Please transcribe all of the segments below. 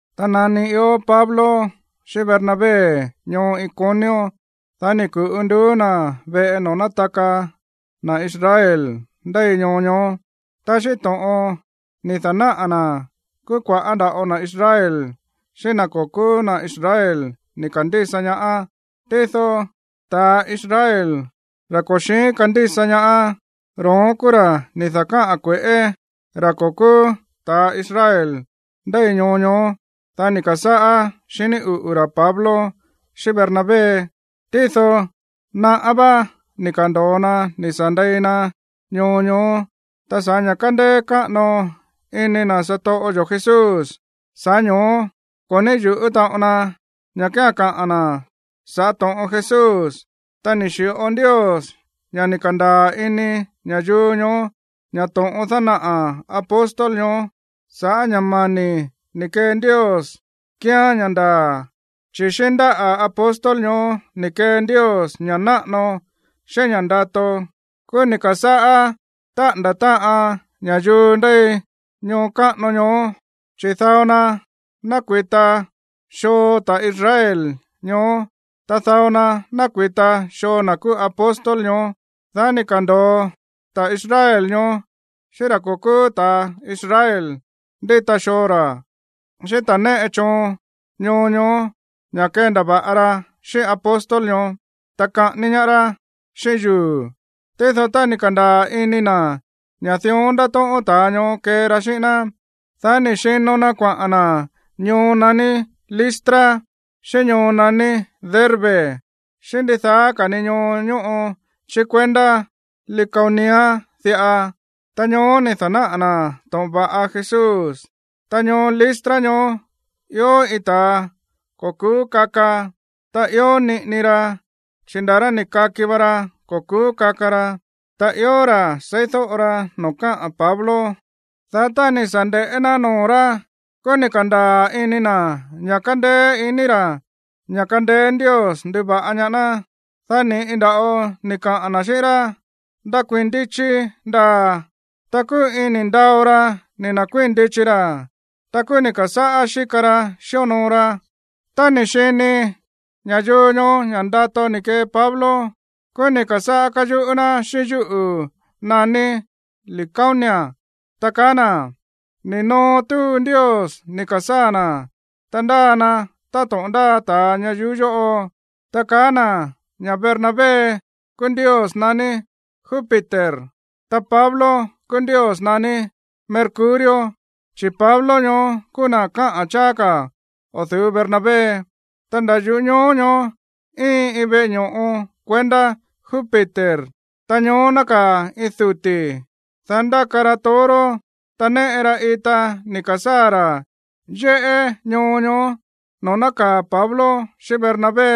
Tá nani ió Pablo xíꞌín Bernabé ñoo Iconio ñoó, dá ni̱ ku̱ꞌu nduú na̱ veꞌe noo̱ nátaka na̱ Israel ndéi ñoo ñoó. Ta xíꞌín to̱ꞌon ni̱ da̱náꞌa̱ na̱, kúú kua̱ꞌá nda̱ꞌo na̱ Israel xíꞌín na̱ ko̱ kúú na̱ Israel ni̱ ka̱ndísa ñaá. Tído ta̱a Israel, ra̱ ko̱ xi̱ín kandísa ñaá, ro̱ón kúú ra̱ ni̱ da̱káꞌa̱n kue̱ꞌé ra̱ ko̱ kúú ta̱a Israel ndéi ñoo ñoó, dá ni̱ ka̱sáꞌá xiní uꞌu̱ ra̱ Pablo xíꞌín Bernabé. Tído naꞌá vá ni̱ ka̱ndo̱o na ni̱ sa̱ ndei na ñoo ñoó. Ta sa̱ꞌá ña̱ kándéé káꞌano iní na̱ satoꞌo yo̱ Jesús, sa̱ꞌá ño̱ó ko̱ ní yu̱ꞌú taꞌon na ña̱ kía̱n kaꞌa̱n na̱ sa̱ꞌá to̱ꞌon Jesús. Ta ni̱ xi̱ꞌo Ndios ña̱ ni̱ ka̱ndaa̱ ini ña̱yuu ñoó ña̱ to̱ꞌon dánaꞌa̱ apóstol ñoó sa̱ꞌá ña̱ mani̱ ni̱ kee Ndios kíán ña̱ ndaa̱, chi̱ xíꞌín ndáꞌa̱ apóstol ñoó ni̱ kee Ndios ña̱ꞌa náꞌano, xíꞌín ña̱ꞌa ndato. Kúú ni̱ ka̱sáꞌá táꞌa̱nda̱ táꞌan ña̱yuu ndéi ñoo káꞌano ñoó, chi̱ dao na nákui̱ta xoo ta̱ Israel ñoó, ta dao na nákui̱ta xoo na̱ kúú apóstol ñoó. Dá ni̱ ka̱ndo̱o ta̱ Israel ñoó xíꞌín ra̱ ko̱ kúú ta̱ Israel ndíta xoo ra̱, xíꞌín ta̱ néꞌe choon ñoo ñoó ña̱ kendava̱ꞌa ra xíꞌín apóstol ñoó, ta kaꞌání ñaá rá xíꞌín yuu̱. Tído tá ni̱ ka̱ndaa̱ ini na̱ ña̱ dión ndátóꞌón ta̱a ñoó kee ra xíꞌín ná, dá ni̱ xino na kuaꞌa̱n na̱ ñoo naní Listra, xíꞌín ñoo naní Derbe, xíꞌín ndidaá ka̱ ni ñoo ñóꞌo chí kuendá Licaonia diꞌa. Ta ñoó ni̱ da̱náꞌa̱ na̱ to̱ꞌon va̱ꞌa Jesús. Ta ñoo Listra ñoó ió iin ta̱a ko̱ ku̱ú kaka. Ta ió niꞌini ra, chi̱ nda̱ rá ni̱ kaki va ra ko̱ ku̱ú kaka ra. Ta ió ra̱ seídóꞌo ra noo̱ káꞌa̱n Pablo. Dá tá ni̱ sa̱ nde̱ꞌé ná noo̱ rá, kúú ni̱ ka̱ndaa̱ ini na̱ ña̱ kándéé iní ra̱ ña̱ kándéé Ndios nduva̱ꞌa ñaá ná. Dá ni̱ꞌi nda̱ꞌo ni̱ kaꞌa̱n na̱ xíꞌín rá: ―¡Ndakuii̱n ndichi ndaa̱! Ta kúú iin ni̱ ndao ra ni̱ nda̱kuíi̱n ndichi ra̱. Ta kúú ni̱ ka̱sáꞌá xíka ra xíonoo ra. Tá ni̱ xini ña̱yuu ñoó ña̱ ndato ni̱ kee Pablo, kúú ni̱ ka̱sáꞌá káyuꞌú ná xíꞌín yúꞌu̱ naní licaónica, ta kaá na̱: ―¡Ni̱ noo túu ndios ni̱ ka̱sáa̱ na̱, ta ndáa na táto̱ꞌon ndáa ta̱a ñayuú yóꞌo! Ta kaá na̱ ña̱ Bernabé kúú ndios naní Júpiter, ta Pablo kúú ndios naní Mercurio, chi̱ Pablo ñoó kúú na̱ káꞌa̱n cháá ka̱ o̱ du̱ú Bernabé. Ta nda̱ yuꞌú ñoo ñoó íin iin veꞌe ño̱ꞌo kuendá Júpiter, ta ñoó nákaa̱ iin duti̱, dá ndáka ra toro, ta néꞌe ra ita ni̱ ka̱sáa̱ ra̱ yéꞌé ñoo ñoó noo̱ nákaa̱ Pablo xíꞌín Bernabé.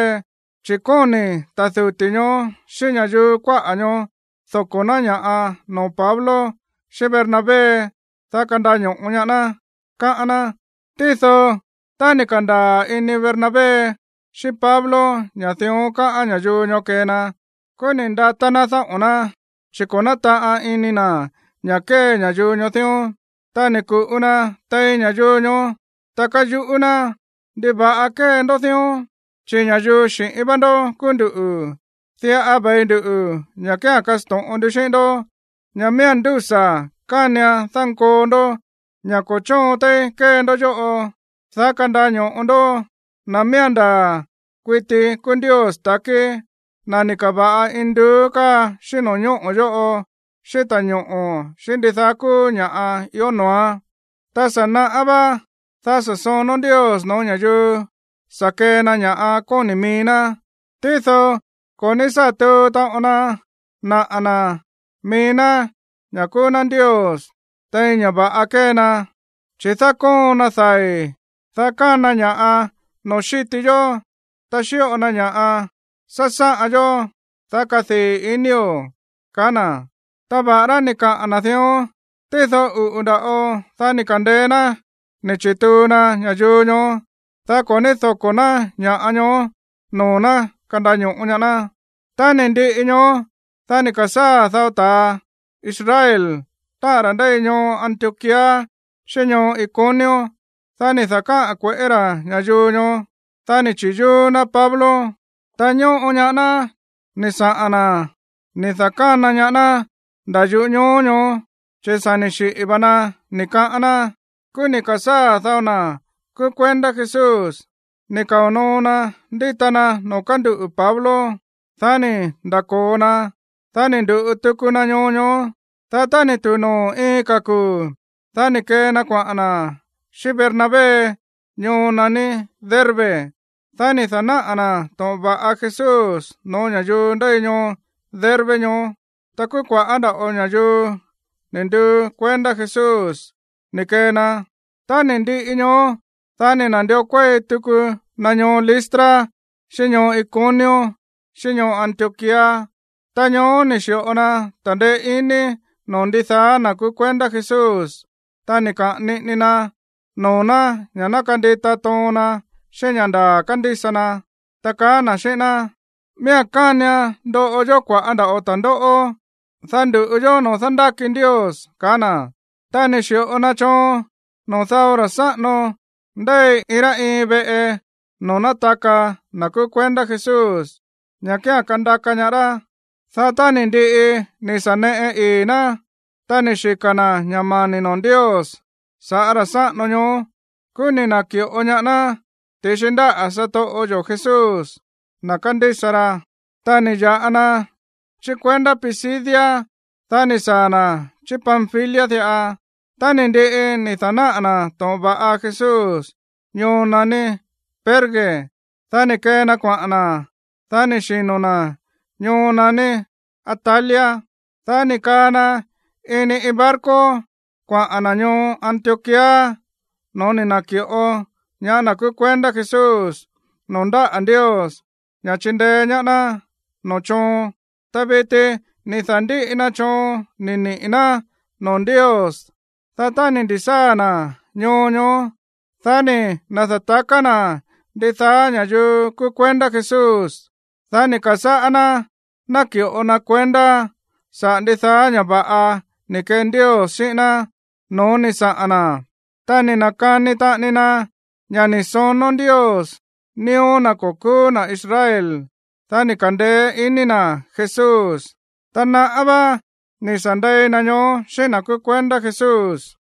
Chi̱ kóni̱ ta̱ duti̱ ñoó xíꞌín ña̱yuu kuáꞌa̱ ñoó doko̱ ná ña̱ꞌa noo̱ Pablo xíꞌín Bernabé, dá kandaño̱ꞌo ñaá ná, káꞌán ná. Tído tá ni̱ ka̱ndaa̱ ini Bernabé xíꞌín Pablo ña̱ dión káꞌán ña̱yuu ñoó kee na, kúú ni̱ ndatá ná dáꞌo̱n ná, chi̱ ko̱ nátaꞌan ini na̱ ña̱ kée ña̱yuu ñoó dión. Ta ni̱ ku̱ꞌu na tein ña̱yuu ñoó, ta káyuꞌú ná: ―¿Ndiva̱ꞌa kée ndó dión? Chi̱ ña̱yuu xi̱ꞌín vá ndó kúú nduꞌu̱. Diꞌa ve̱i nduꞌu̱ ña̱ kía̱n kasto̱ꞌon ndu xíꞌín ndoꞌó ña̱ miía̱n ndúsa̱ kánian dánkoo ndó ña̱ ko̱ chóon téí kée ndó yóꞌo, dá kandaño̱ꞌo ndó na̱ miía̱n ndaa̱ kuiti kúú Ndios ta̱kí, na̱ ni̱ ka̱va̱ꞌa induú káa xíꞌín no̱ñóꞌo̱ yóꞌo xíꞌín ta̱ñoꞌo̱ xíꞌín ndidaá kúú ña̱ꞌa ió noo̱án. Tá sa̱ naꞌá vá, dá sa̱ sonó Ndios no̱ó ña̱yuu sa̱ kee na ña̱ kóni̱ mií ná. Tído ko̱ ní sá tuu taꞌon na naꞌa̱ na̱ mií ná ña̱ kúú ná Ndios tein ña̱ va̱ꞌa kée na, chi̱ dákóon na dai̱, dá kana ña̱ꞌa noo̱ xíti yó. Ta xíꞌo na ña̱ꞌa sásáꞌan yó, dá kadii̱ inío̱ ―kaá na̱. Ta va̱ꞌará ni̱ kaꞌa̱n na̱ dión, tído uꞌu̱ nda̱ꞌo, dá ni̱ ka̱ndeé ná ni̱ chi̱tuu na ña̱yuu ñoó, dá ko̱ ní doko̱ ná ña̱ꞌa ñoó noo̱ ná kandaño̱ꞌo ñaá ná. Tá ni̱ ndiꞌi ñoó, dá ni̱ ka̱sáa̱ dao ta̱ Israel, táꞌa̱n ra̱ ndéi ñoo Antioquía xíꞌín ñoo Iconio. Dá ni̱ da̱káꞌa̱n kue̱ꞌé ra̱ ña̱yuu ñoó, dá ni̱ chi̱yúú ná Pablo. Ta ñóꞌo ñaá ná ni̱ saꞌa̱n na̱ ni̱ da̱kána ñaá ná nda̱ yuꞌú ñoo ñoó, chi̱ sa̱ ni̱ xiꞌi̱ va na, ni̱ kaꞌán ná. Kúú ni̱ ka̱sáa̱ dao na̱ kúú kuendá Jesús ni̱ kao̱ noo na ndíta na noo̱ kánduꞌu̱ Pablo. Dá ni̱ nda̱ko̱o na, dá ni̱ ndu̱ꞌu tuku na ñoo ñoó. Dá tá ni̱ tu̱u noo̱ iin ka̱ kuu̱, dá ni̱ kee na kuaꞌa̱n na̱ xíꞌín Bernabé ñoo naní Derbe. Dá ni̱ da̱náꞌa̱ na̱ to̱ꞌon va̱ꞌa Jesús no̱ó ña̱yuu ndéi ñoo Derbe ñoó. Ta kúú kua̱ꞌá nda̱ꞌo ña̱yuu ni̱ nduu kuendá Jesús ni̱ kee na. Tá ni̱ ndiꞌi ñoó, dá ni̱ na̱ndió kuéi tuku na ñoo Listra xíꞌín ñoo Iconio, xíꞌín ñoo Antioquía. Ta ñoó ni̱ xi̱ꞌo na ta̱ndeé iní noo̱ ndidaá na̱ kúú kuendá Jesús, ta ni̱ kaꞌa̱n niꞌini na noo̱ ná ña̱ ná kandita toon na xíꞌín ña̱ ndaa̱ kándísa na, ta kaá na̱ xíꞌín ná: “Miía̱n kánian ndoꞌo yó kua̱ꞌá nda̱ꞌo ta̱ndóꞌó, dá ndu̱ꞌu yó noo̱ dándáki Ndios”, kaá na̱. Ta ni̱ xi̱ꞌo na choon noo̱ dao ra̱ sáꞌano ndéi iin rá iin veꞌe noo̱ nátaka na̱ kúú kuendá Jesús ña̱ kía̱n kandaka ñaá rá. Dá tá ni̱ ndiꞌi ni̱ sa̱ neꞌe ii̱ ná, ta ni̱ xika̱ na̱ ña̱ mani̱ noo̱ Ndios sa̱ꞌá ra̱ sáꞌano ñoó, kúú ni̱ na̱ki̱ꞌo ñaá ná ti̱xi ndáꞌa̱ satoꞌo yo̱ Jesús, na̱ kándísa ra. Tá ni̱ ya̱ꞌa na chí kuendá Pisidia, dá ni̱ saa̱ na̱ chí Panfilia diꞌa. Tá ni̱ ndiꞌi ni̱ da̱náꞌa̱ na̱ to̱ꞌon va̱ꞌa Jesús ñoo naní Perge, dá ni̱ kee na kuaꞌa̱n na̱, dá ni̱ xino̱ na̱ ñoo naní Atalia. Dá ni̱ kaa na ini iin barco kuaꞌa̱n na̱ ñoo Antioquía no̱ó ni̱ na̱ki̱ꞌo ñaá na̱ kúú kuendá Jesús noo̱ ndáꞌa̱ Ndios ña̱ chindeé ñaá ná noo̱ chóon. Ta viti ni̱ da̱ndíꞌi na choon ni̱ niꞌi̱ ná noo̱ Ndios. Dá tá ni̱ ndi̱sáa̱ na̱ ñoo ñoó, dá ni̱ na̱da̱taká na̱ ndidaá ña̱yuu kúú kuendá Jesús. Dá ni̱ ka̱sáꞌá ná náki̱ꞌo na kuendá saꞌa̱ ndidaá ña̱ va̱ꞌa ni̱ kee Ndios xíꞌín ná no̱ó ni̱ saꞌa̱n na̱. Ta ni̱ na̱kani taꞌani na ña̱ ni̱ sonó Ndios nío̱ na̱ ko̱ kúú na̱ Israel, dá ni̱ ka̱ndeé iní na̱ Jesús. Ta naꞌá vá ni̱ sa̱ ndei na ñoó xíꞌín na̱ kúú kuendá Jesús.